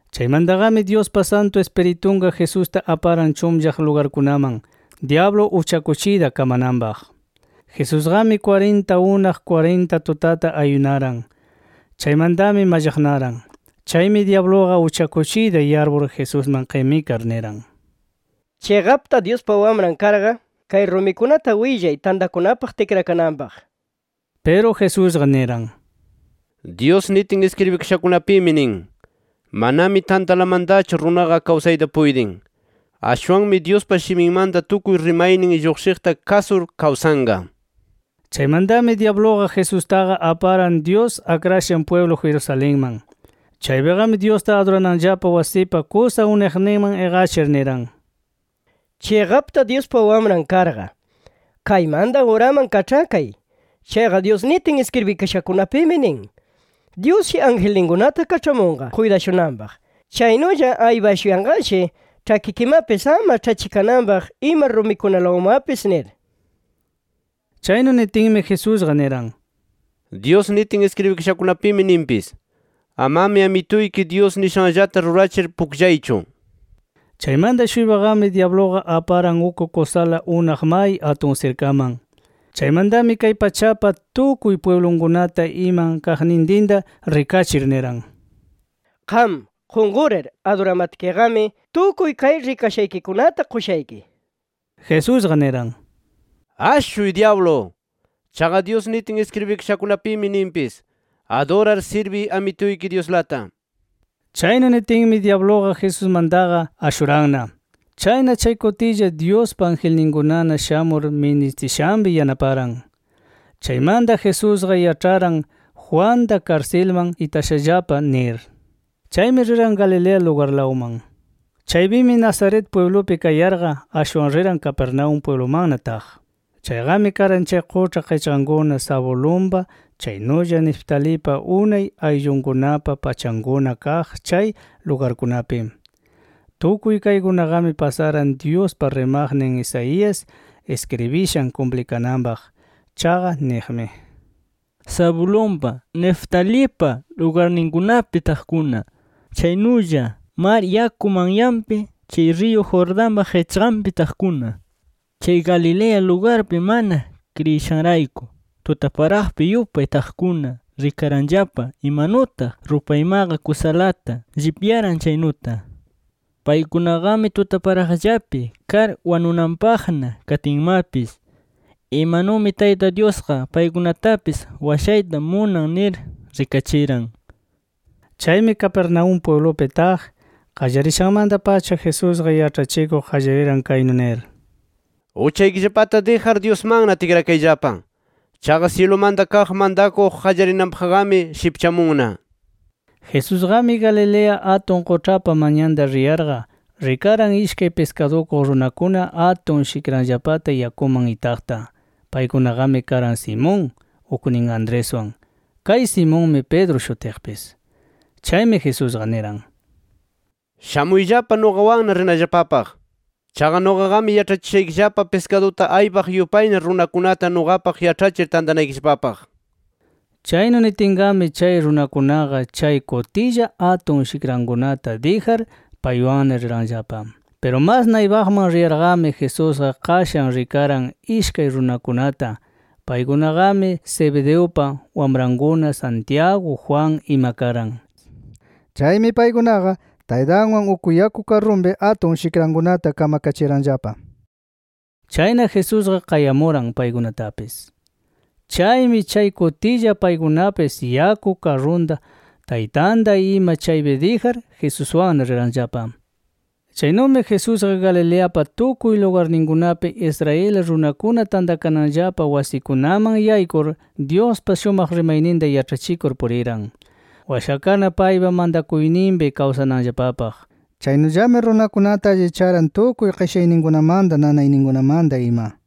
Chaymantaqami Dyuspa Santu Ispiritunqa Jesusta aparan chunllaq lugarkunaman dyablu uchakuchiyta kamananpaq. Jesusqami kwarinta unaq, kwarinta tutata ayunaran. Chaymantami mallaqnaran. Chaymi dyabluqa uchakuchiyta yarpur, Jesusman qimikar niran: —Chiqapta Dyuspa Wamran karqa, kay rumikunata willay tantakunapaq tikrakananpaq nir. Piru Jesusqa niran: —Dyus nitin iskribikashakunapimi nin: ‘Manami tantalamantachu runaqa kawsayta puytin. Ashwanmi Dyuspa shiminmanta tukuy rimaynin lluqshiqta kasur kawsanqa’ nir. Chaymantami dyabluqa Jesustaqa aparan Dyus akrashan pwiblu Jerusalenman. Chaypiqami Dyusta adurananllapa wasipa kusa unaqninman iqachir, niran: —Chiqapta Dyuspa Wamran karqa, kaymanta uraman kaĉhakay. Chaqa Dyus nitin iskribikashakunapimi, nin: ‘Dyusshi, angelninkunata kaĉhamunqa kuytashunanpaq. Chaynulla aypashuyanqashi ĉhakikimapis ama ĉhachikananpaq ima rumikunalawanmapis’ nir. Chaynu nitinmi, Jesusqa niran: —Dyus nitin iskribikashakunapimi ninpis: ‘Amami Amituyki Dyus nishanllata rurachir pukllaychu’ nir. Chaymanta-shuypaqami dyabluqa aparan uk kusala unaq may atun sirkaman. Chaymantami kay pachapa tukuy pwiblunkunata iman kaqnintinta rikachir, niran: —Qam qunqurir aduramatkiqami tukuy kay rikashaykikunata qushayki nir. Jesusqa niran: —¡Ashuy, dyablu! Chaqa Dyus nitin iskribikashakunapimi ninpis: ‘Adurar sirbiy Amituyki Dyuslata’ nir. Chaynu nitinmi dyabluqa Jesusmantaqa ashuranna. Chayna chay kutilla, Dyuspa angelninkunana shamur ministishanpi yanaparan. Chaymanta Jesusqa yaĉharan Juanta karsilman itashallapa nir. Chaymi riran Galilea lugarlawman. Chaypimi Nazaret pwiblupi kayarqa, ashwan riran Capernaúm pwiblumanna taq. Chayqami karan chay quĉha qichqankuna Zabulonpa, chaynulla Neftalipa unay ayllunkunapa pachankuna kaq chay lugarkunapi. Tukuy kaykunaqami pasaran Dyuspa rimaqnin Isaías iskribishan kumplikananpaq. Chaqa niqmi: “Zabulonpa, Neftalipa lugarninkunapi taqkuna, chaynulla mar yaku manyanpi, chay riyu Jordanpa qichqanpi taqkuna, chay Galilea lugarpi mana kriyishanrayku tutaparaqpi yupay taqkuna rikaranllapa imanutaq rupaymaqa kusalata llipyaran chaynuta. Paykunaqami tutaparaqllapi kar wanunanpaqna katinmapis, imanumi Tayta Dyusqa paykunatapis washayta munan nir rikachiran”. Chaymi Capernaúm pwiblupi taq qallarishanmanta-pacha Jesusqa yaĉhachikuq qallariran kaynu nir: “Uchaykillapata dijar Dyusmanna tikrakayllapa. Chaqa syilumanta kaq mantakuq qallarinanpaqqami shipchamunna” nir. Jesusqami Galilea atun quĉhapa manyanta riyarqa, rikaran ishkay piskadukuq runakuna atun shikranllapata yakuman itaqta. Paykunaqami karan, Simón uknin Andreswan. Kay Simonmi Pedro shutiqpis. Chaymi Jesusqa niran: —Shamuyllapa nuqawanna rinallapapaq. Chaqa nuqaqami yaĉhachishaykillapa piskaduta aypaq yupayna runakunata nuqapaq yaĉhachir tantanaykillapapaq nir. Chaynu nitinqami, chay runakunaqa chay kutilla atun shikrankunata dijar, paywanna riranllapa. Piru mas naypaqman riyarqami Jesusqa qashan rikaran ishkay runakunata. Paykunaqami Zebedeupa wamrankuna, Santiago, Juan ima karan. Chaymi paykunaqa taytanwan uk yaku karrunpi atun shikrankunata kamkachiyaranllapa. Chayna Jesusqa qayamuran paykunatapis. Chaymi, chay kutilla paykunapis yaku karrunta, taytanta ima chaypi dijar, Jesuswanna riranllapa. Chaynumi Jesusqa Galileapa tukuy lugarninkunapi Israel runakuna tantakananllapa wasikunaman yaykur Dyuspa shumaq rimayninta yaĉhachikur puriran, washakarna paypa mantakuyninpi kawsananllapapaq. Chaynullami runakunata allicharan tukuy qishayninmanta, nanayninkunamanta ima.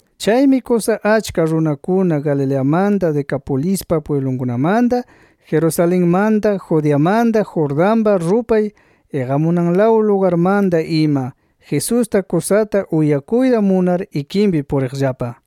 Chaymi kusa achka runakuna Galileamanta, Decapolispa pwiblunkunamanta, Jerusalenmanta, Judeamanta, Jordanpa rupay iqamunanlaw lugarmanta ima, Jesusta kusata uyakuyta munar ikinpi puriqllapa.